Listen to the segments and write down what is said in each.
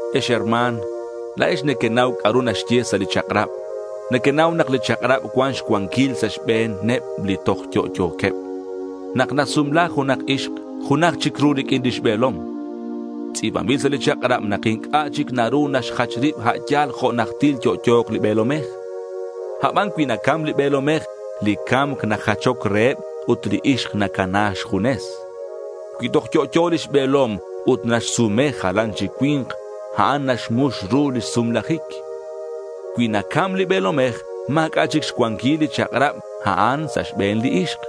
Ex herma̱n, la̱ex nequenau c'a'ru naxye sa' li chak'rab. Nequenau nak li chak'rab cuan xcuanquil sa' xbe̱neb li toj yo'yo̱queb. Nak nasumla junak ixk junaj chic ru riq'uin lix be̱lom. Tz'i̱banbil sa' li chak'rab nak inc'a' chic naru neque'xjach rib a' yal jo' najtil yo'yo̱k li be̱lomej. Aban cui nacam li be̱lomej, li ca̱mc najachoc reheb ut li ixk nacana xjunes. Cui toj yo'yo lix be̱lom ut naxsume jalan chic cui̱nk, a'an naxmux ru lix sumlajic. Cui nacam li be̱lomej, ma̱c'a' chic xcuanquil li chak'rab a'an sa' xbe̱n li ixk.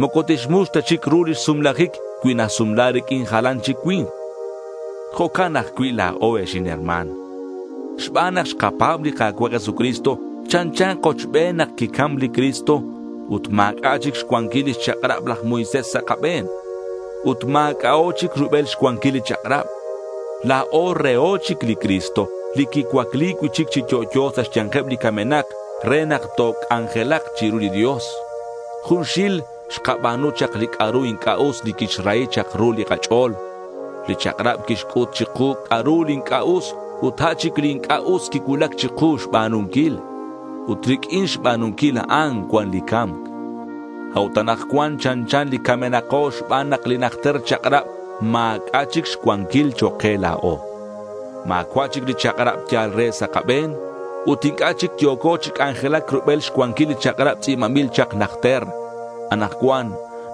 Moco tixmux ta chic ru lix sumlajic cui nasumla riq'uin jalan chic cui̱nk. Jo'can ajcui' la̱o, ex inherma̱n. Xban nak xkapa̱b li Jesucristo chanchan kochben nak quicam li Cristo. Ut ma̱c'a' chic xcuanquil lix chak'rab laj Moisés sa' kabe̱n. Ut ma̱c'a'o chic rubel xcuanquil li chak'rab. La̱o reho chic li Cristo li quicuacli cui'chic chi yo'yo sa' xya̱nkeb li camenak re nak toc'anjelak chiru li Dios. Junxil xkaba̱nu chak li c'a'ru inc'a' us li quixrahi chak ru li kach'o̱l. Li chak'rab quixc'ut chiku c'a'ru li inc'a' us ut a' chic li inc'a' us quicuulac chiku xba̱nunquil. Ut riq'uin xba̱nunquil a'an cuan li ca̱mc. A'ut anakcuan chanchan li camenako xban nak li najter chak'rab ma̱c'a' chic xcuanquil chok' ke la̱o. Ma̱cua' chic li chak'rab yal re sa' kabe̱n. Ut inc'a' chic yo̱co chi c'anjelac rubel xcuanquil li chak'rab tz'i̱banbil chak najter. Anakcuan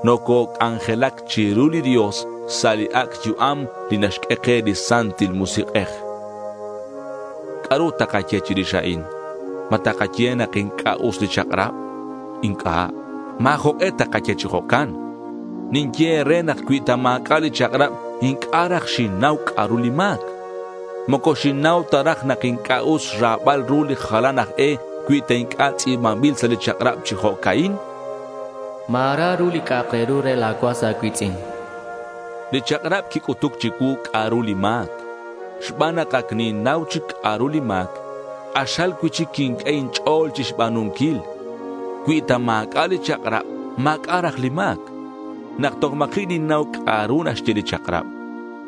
nococ'anjelac chiru li Dios sa' li ac' yu'am li naxq'ue ke li Santil Musik'ej. ¿C'a'ru takaye chirix a'in? ¿Ma takaye nak inc'a' us li chak'rab? Inc'a'. Ma̱ jok'e takaye chi jo'can. Ninye e̱re nak cui ta ma̱c'a' li chak'rab, inc'a' raj xinnau c'a'ru li ma̱c. Moco xinnau ta raj nak inc'a' us xra̱bal ru li jalan aj e, cui ta inc'a' tz'i̱banbil sa' li chak'rab chi jo'ca'in: Ma̱ra ru li c'a'ru re la̱ cuas a̱cui̱tz'in. Li chak'rab quic'utuc chicuu c'a'ru li ma̱c. Xban nak ac ninnau chic c'a'ru li ma̱c, k'axal cui'chic quinq'ue inch'o̱l chixba̱nunquil. Cui ta ma̱c'a' li chak'rab ma̱c'a' raj li ma̱c. Nak toj ma̱ji' ninnau c'a'ru naxye li chak'rab,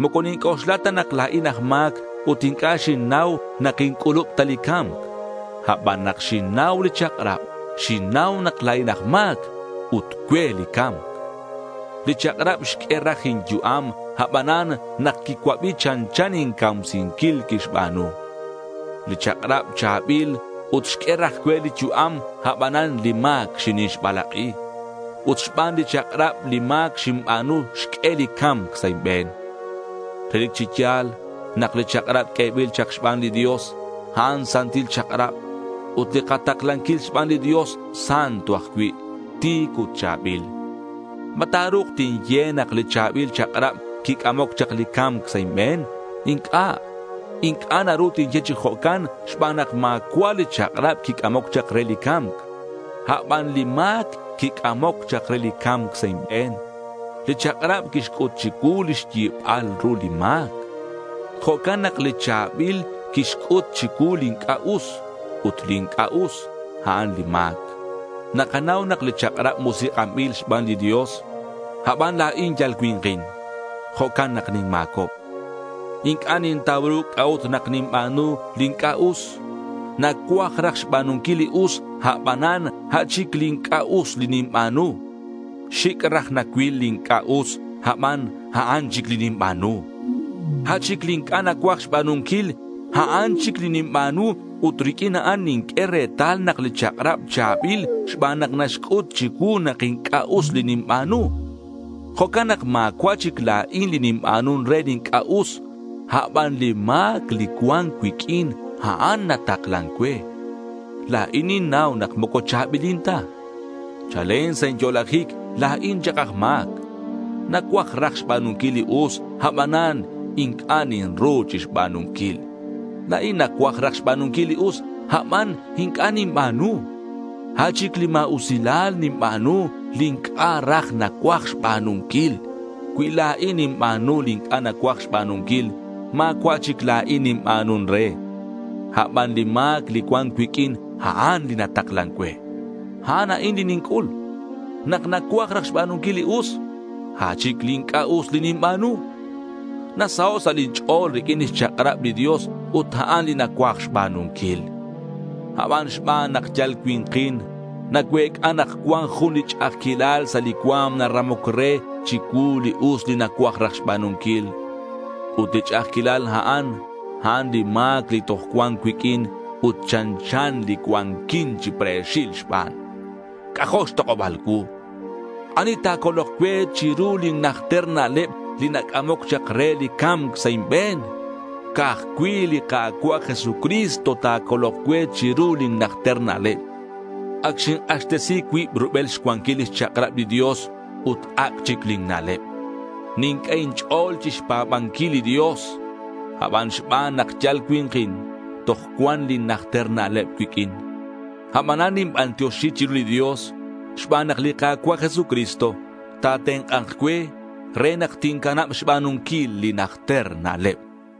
moco ninc'oxla ta nak la̱in aj ma̱c ut inc'a' xinnau nak inc'ulub ta li ca̱mc. Aban nak xinnau li chak'rab, xinnau nak la̱in aj ma̱c. Ut cue li ca̱mc. Li chak'rab xq'ue raj inyu'am, abanan nak quicuabi chanchan incamsinquil quixba̱nu. Li chak'rab cha̱bil ut xq'ue raj cue li yu'am, abanan li ma̱c xinixbalak'i. Ut xban li chak'rab, li ma̱c xinba̱nu xq'ue li ca̱mc sa' inbe̱n. Relic chi ya̱l nak li chak'rab q'uebil chak xban li Dios, a'an santil chak'rab, ut li kataklanquil xban li Dios santo ajcui', ti̱c ut cha̱bil. ¿Ma ta̱ru̱k tinye nak li cha̱bil chak'rab quic'amoc chak li ca̱mc sa' inbe̱n? Inc'a'. Inc'a' naru tinye chi jo'can xban nak ma̱cua' li chak'rab quic'amoc chak re li ca̱mc. Aban li ma̱c quic'amoc chak re li ca̱mc sa' inbe̱n. Li chak'rab quixc'ut chicuu lix yibal ru li ma̱c. Jo'can nak li cha̱bil quixc'ut chicuu li inc'a' us. Ut li inc'a' us a'an li ma̱c. Nakanau nak li chak'rab musik'anbil xban li Dios. Aban la̱in yal cui̱nkin. Jo'can nak ninma̱cob. Inc'a' nintau ru c'a'ut nak ninba̱nu li inc'a' us. Nacuaj raj xba̱nunquil li us, abanan a' chic li inc'a' us li ninba̱nu. Xic' raj nacuil li inc'a' us aban a'an chic li ninba̱nu. A' chic li inc'a' nacuaj xba̱nunquil, a'an chic li ninba̱nu ut riq'uin a'an ninq'ue retal nak li chak'rab cha̱bil xban nak naxc'ut chicuu nak inc'a' us li ninba̱nu. Jo'can nak ma̱cua' chic la̱in li ninba̱nun re li inc'a' us, aban li ma̱c li cuan cuiq'uin, a'an nataklan cue. La̱in ninnau nak moco cha̱bilin ta. Chalen sa' inyo'lajic la̱in chak aj ma̱c. Nacuaj raj xba̱nunquil li us, abanan inc'a' ninru chixba̱nunquil. La̱in nacuaj raj xba̱nunquil li us, aban inc'a' ninba̱nu. A' chic li ma̱usilal ninba̱nu, li inc'a' raj nacuaj xba̱nunquil. Cui la̱in ninba̱nu li inc'a' nacuaj xba̱nunquil, ma̱cua' chic la̱in ninba̱nun re; aban li ma̱c li cuan cuiq'uin, a'an li nataklan cue. A'an a'in li ninc'ul: Nak nacuaj raj xba̱nunquil li us, a' chic li inc'a' us li ninba̱nu. Nasaho' sa' lin ch'o̱l riq'uin lix chak'rab li Dios ut a'an li nacuaj xba̱nunquil. Aban xban nak yal cui̱nkin, nacuec'a nak cuan jun li ch'a'ajquilal sa' li cua̱m naramoc re chicuu li us li nacuaj raj xba̱nunquil. Ut li ch'a'ajquil a'an, a'an li ma̱c li toj cuan cuiq'uin, ut chanchan li cuanquin chi pre̱xil xban. ¡C'ajo' xtok'oba̱l cuu! ¿Ani ta̱colok cue chiru lin najter na'leb li nac'amoc chak re li ca̱mc sa' inbe̱n? Ca'aj cui' li Ka̱cua' Jesucristo ta̱colok cue chiru lin najter na'leb. Ac xink'axtesi cuib rubel xcuanquil lix chak'rab li Dios ut ac' chic lin na'leb. Ninq'ue inch'o̱l chixpa̱banquil li Dios, aban xban nak yal cui̱nkin, toj cuan lin najter na'leb cuiq'uin. Abanan ninbantioxi chiru li Dios xban nak li Ka̱cua' Jesucristo ta̱tenk'a̱nk cue re nak tincanab xba̱nunquil lin najter na'leb.